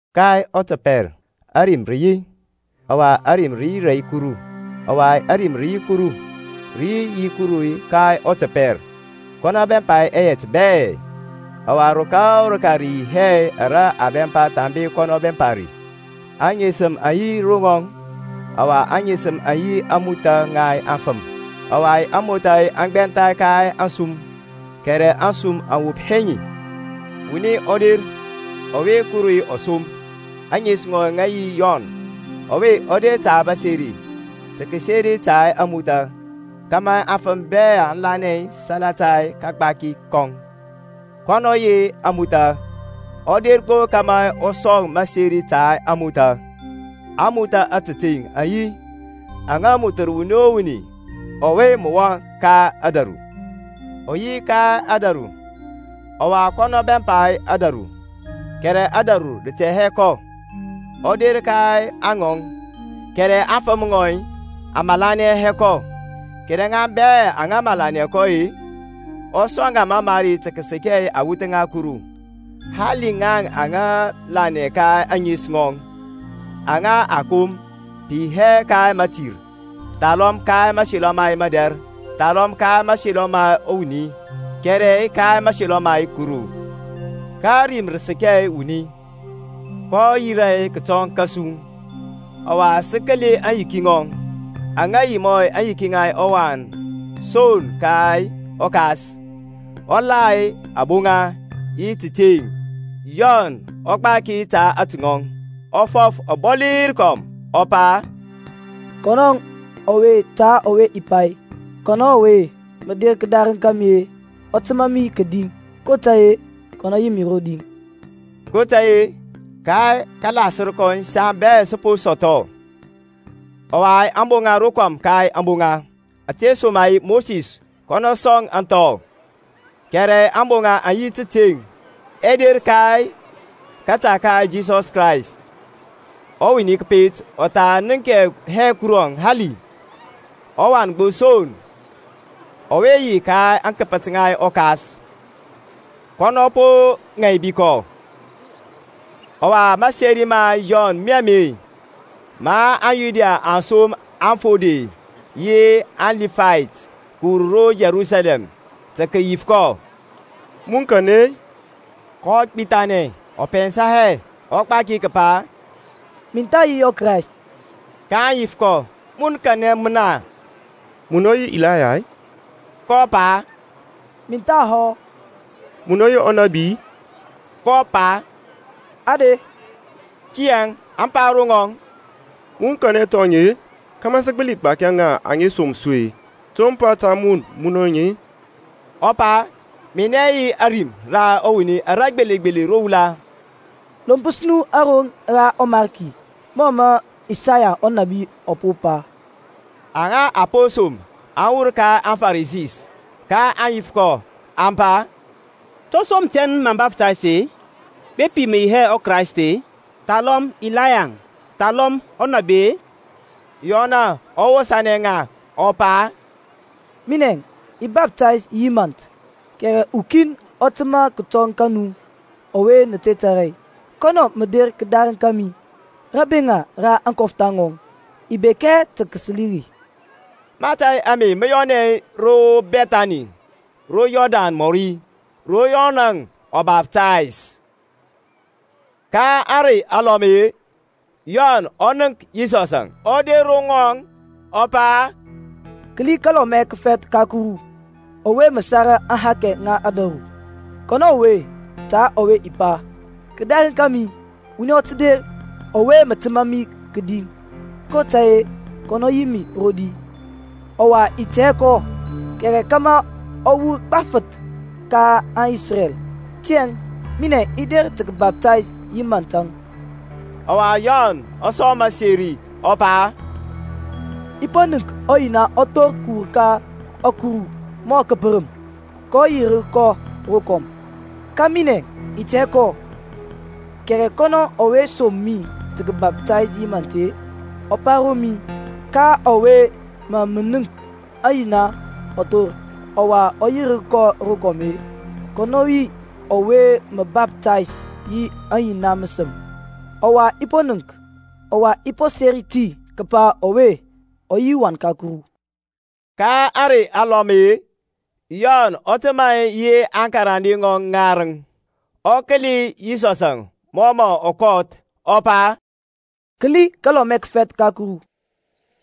Ka ɔtəpɛr Ȧrim rə yi, ɔwa Ȧrim rə yi rɛ Kuru, ɔwa Ȧrim rə yi Kuru. Rə yi yi Kuru ka ɔtəpɛr. Kɔnɔ bɛmpa ɛyɛt bɛ; ɔwa rəka o rəka rə yi hɛ ara a bɛmpa thambe kɔnɔ bɛmpa ri. Aŋesəm aŋ yi ro ŋɔŋ: ɔwa aŋesəm aŋ yi ȧŋmothȧ ŋa afəm. Ɔwa ȧŋmothȧ aŋ gbɛntha ka ȧŋsum: kɛrɛ ȧŋsum aŋ wop hɛ ŋi. Wuni ɔ der, ɔwe Kuru ɔ som, ȧŋes ŋɔŋ ŋa yi Yɔn. Ɔwe ɔ der ta məseri, tə kəseri ta ȧŋmothȧ, kȧmȧ afəm bɛ aŋ lanɛ salata kagbaki kɔŋ. Kɔnɔŋ ɔ yi hɛ ȧŋmothȧ, ɔ der gbo kȧmȧ ɔ sɔŋ məseri ta ȧŋmothȧ. ȧŋmothȧ ȧtəteŋ aŋ yi, aŋa mothər wuni o wuni, ɔwe mə wɔŋ ka ȧdȧru. Ɔ yi ka ȧdȧru, ɔwa kɔnɔ bɛmpa ȧdȧru, kɛrɛ ȧdȧru rə tɛ hɛ kɔ. Ɔ der ka aŋɔŋ, kɛrɛ aŋfəm ŋɔŋ aŋ malanɛ hɛ kɔ. Kɛrɛ ŋa bɛ aŋa malanɛ kɔ-e, ɔ sɔŋ ŋa mamari tə kəsəkɛ awuth ŋa Kuru, hali ŋaŋ aŋa lanɛ ka ȧŋes ŋɔŋ: aŋa a kom, pə yi hɛ ka mətir, thalɔm ka mȧselɔ ma madɛr, thalɔm ka mȧselɔ ma wuni, kɛrɛ ka mȧselɔ ma Kuru. Ka Ȧrim rə səkɛ wuni, kɔ yirȧ kətɔŋ kȧsu, ɔwa sə kəli aŋyiki ŋɔŋ, aŋ yi mɔ aŋyiki ŋa ɔWan son ka ɔKas, ɔ la aboŋa yi tȧteŋ. Yɔnȧŋ ɔ gbaki ta atɔŋ, ɔ fɔf ɔbɔli rəkɔm, ɔ pa, Kɔnɔŋ ɔwe ta ɔwe i pa, Kɔnɔ ɔwe mə der kədarəŋ ka mi-e ɔ təmȧ mi kədi: kotȧy-e kɔnɔ yi mi rodi. kotȧy-e ka kalasər kɔŋ saŋ bɛ sə po sɔthɔ, ɔwa aboŋa rokɔm ka aboŋa. Ȧtesoma-e Mosisȧŋ kɔnɔ sɔŋ ȧŋthɔ; kɛrɛ ȧŋboŋa yi tȧteŋ ɛ der ka kȧta ka Yisɔs Krayst. Wuni kəpet ɔ tha nənk hɛ Kuru hali; ɔWan gbo son, ɔwe yi ka aŋkəpət ŋa ɔKas, kɔnɔ ɔ po ŋaibi kɔ. Ɔwa maseri ma Yɔn mi ame; ma aŋYuda aŋ som aŋfode yi aŋLibayt kəwur ro Yerusalɛm tə kəyif kɔ, Mun kanɛ-e? kɔ gbithanɛ, ɔ pɛnsa hɛ; ɔ gbaki kəpa, Min tha yi ɔKrayst. kaŋ yif kɔ, Mun kanɛ mən-e? Munɔ yi Elaya-i? kɔ pa, Min thahɔ. Munɔ yi ɔnabi-i? kɔ pa, Ade. Tiyȧŋ aŋ pa ro ŋɔŋ, Mun kanɛ thɔŋ-e? kȧmȧ sə gbəli gbaki ŋa aŋa som su-e. To mə pa ta mun munɔnɛ-e? Ɔ pa, Minɛ yi ȧrim ra wuni ara gbelegbele ro wula, Lompəs nu aroŋ ra ɔMarki, mɔ mə Isaya ɔnȧbi ɔ po pa. Aŋa a po som aŋ wur ka aŋFarisi, kaŋ yif kɔ, aŋ pa, To som tɛn mə baftays-e, bepi mə yi hɛ ɔKraist-e, thalɔm Ilayaŋ, thalɔm ɔnabi-e? Yɔnȧŋ ɔ wosȧnɛ ŋa, ɔ pa, Minɛŋ, i baftays yi mȧnt, kɛrɛ ukin ɔ təmȧ kətɔŋ ka nu ɔwe nə te tȧrȧ, kɔnɔ mə der kədarəŋ kȧmi, rabeŋa ra aŋkɔftha ŋɔŋ i bek hɛ tə kəsəli ri. Mȧtȧy ame mə yɔnɛ ro Bɛthani ro Yɔrdan mɔri, ro Yɔnȧŋ ɔ baftays. Ka ȧŋrey alɔm-e, Yɔnȧŋ ɔ nənk Yisɔsȧŋ ɔ der ro ŋɔŋ, ɔ pa, Kəli kaLɔmɛ kəfɛth ka Kuru ɔwe mə sara aŋhakɛ ŋa ȧdȧru! Kɔnɔ ɔwe ta ɔwe i pa, Kədarəŋ kȧmi wuni ɔ tə der ɔwe mə təmȧ mi kədi; kotȧy-e kɔnɔ yi mi rodi. Ɔwa i tɛ hɛ kɔ: kɛrɛ kȧmȧ ɔ wur gbafəth ka aŋIsrɛl tiyȧŋ minɛŋ i der tə kəbaptays yi mȧntȧŋ. Ɔwa Yɔnȧŋ ɔ sɔŋ məseri, ɔ pa, I po nənk ɔYina ɔ thor kəwur ka ȧkuru mɔ kəpərəm; kɔ yirər kɔ rokɔm. Ka minɛŋ i tɛ hɛ kɔ: kɛrɛ kɔnɔ ɔwe som mi tə kəbaptais yi mȧnt-e, ɔ pa ro mi, Ka ɔwe mȧ mə nənk ɔYina ɔ thor, ɔwa ɔ yirər kɔ rokɔm-e, kɔnɔ yi ɔwe mə baftays yi ɔYina məsəm. Ɔwa i po nənk, ɔwa i po seri ti kəpa ɔwe ɔ yi ɔWan ka Kuru. Ka ȧŋrey alɔm-e, Yɔnȧŋ ɔ təmȧ yi aŋkarande ŋɔŋ ŋarəŋ: ɔ kəli Yisɔsȧŋ mɔ mɔ kɔth-e, ɔ pa, Kəli kaLɔmɛ kəfɛth ka Kuru!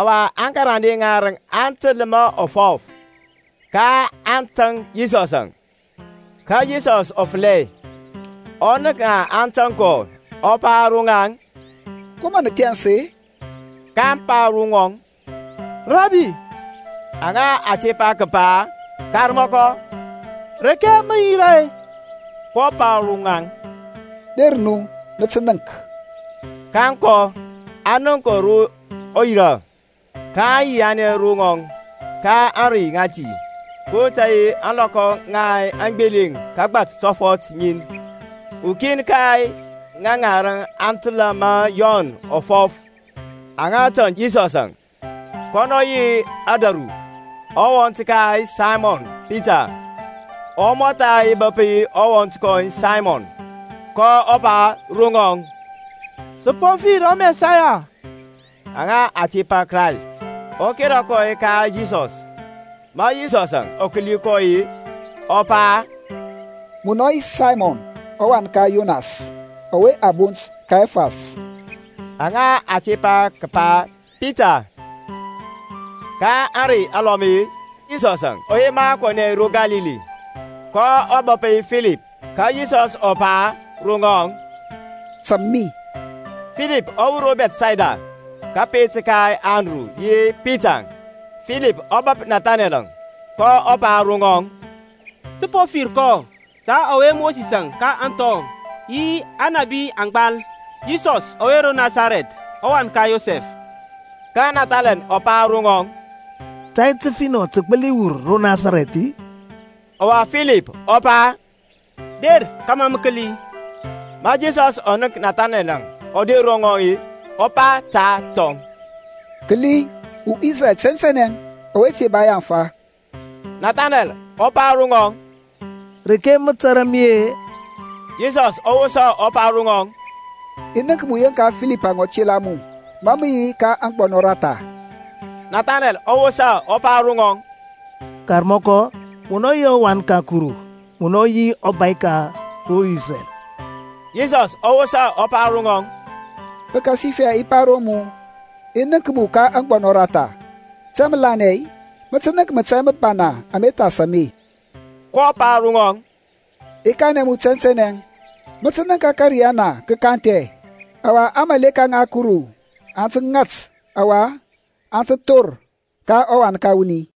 Ɔwa aŋkarande ŋarəŋ aŋ təl ma ɔ fɔf, kaŋ tȧŋ Yisɔsȧŋ. Ka Yisɔs ɔ fəlɛ, ɔ nənk aŋ tȧŋ kɔ-e, kɔ pa ro ŋaŋ, Ko mə nə thɛns-e? kaŋ pa ro ŋɔŋ, Rabi, aŋa a tepa kəpa, Karmɔkɔ, reke mə yira-e? kɔ pa ro ŋaŋ, Der nu, nə tə nənk. Kaŋ kɔ, aŋ nənk ro ɔ yirȧ, kaŋ yianɛ ro ŋɔŋ ka ȧŋrey ŋati: kotȧy-e ȧŋlɔkɔ ŋa aŋgbeleŋ kagbat tɔfɔt ŋiəŋ. Ukin ka aŋarəŋ aŋa təlȧ ma Yɔn ɔ fɔf-e, aŋa tȧŋ Yisɔsȧŋ, kɔnɔ yi Andru, ɔwɔnt ka Saymɔn Pita. Ɔ mɔtha bəp ɔwɔnt kɔŋ Saymɔn, kɔ pa ro ŋɔŋ, Sə po fir ɔMɛsaya (aŋa a tepa Krayst). Ɔ kera kɔ ka Yisɔs. Ma Yisɔsȧŋ ɔ kəli kɔ-e, ɔ pa, Munɔ yi Saymɔn ɔwan ka Yonas: ɔwe a bont Kefas (aŋa a tepa kəpa Pita). Ka ȧŋrey alɔm-e, Yisɔsȧŋ ɔ yema kɔnɛ ro Kalili, kɔ bəp Filipȧŋ: ka Yisɔs ɔ pa ro ŋɔŋ, Tȧŋ mi. Filipȧŋ ɔ wur ro Bɛthsayda, kȧpet ka Andru yi Pitaŋ. Filipȧŋ ɔ bəp Nathaneɛl, kɔ pa ro ŋɔŋ, Sə po fir kɔ, ta ɔwe Mosisȧŋ ka aŋthɔ, yi Aŋnȧbi aŋ gbal, Yisɔs ɔwe ro Nasarɛth, ɔwan ka Yosɛf. Ka Nathaneɛl ɔ pa ro ŋɔŋ, Tai təfinɔ tə gbəli wur ro Nasarɛth-i? Ɔwa Filip ɔ pa, Der kȧmȧ mə kəli. Ma Yisɔs ɔ nənk Nathaneɛl ɔ der ro ŋɔŋ-e, ɔ pa ta atɔŋ, Kəli uIsreɛl tɛntɛnɛ, ɔwe te ba yaŋfa! Nathaneɛl ɔ pa ro ŋɔŋ, Reke mə tȧrȧ mi-e? Yisɔs ɔ wosa ɔ pa ro ŋɔŋ, I nənk mu yeŋka Filipȧŋ ɔ tela mu, ma mə yi ka aŋgbɔnɔ ratha. Nathanɛlȧŋ ɔ wosa ɔ pa ro ŋɔŋ, Karmɔkɔ, munɔ yi ɔWan ka Kuru; munɔ yi ɔbȧy ka ro Isrɛl. Yisɔsȧŋ ɔ wosa ɔ pa ro ŋɔŋ, Pəkasifɛ i pa ro mu, I nənk mu ka aŋgbɔnɔ ratha, tiyȧŋ mə lanɛ-i? Mə tə nənk mȧtȧy məbana ama thas ame. kɔ pa ro ŋɔŋ, I kanɛ mu tɛntɛnɛ, mə tə nənk ȧkȧriyana kə kanthi, ɔwa aŋmȧleka ŋa Kuru aŋ tə ŋat ɔwa aŋ tə thor ka ɔWan ka wuni.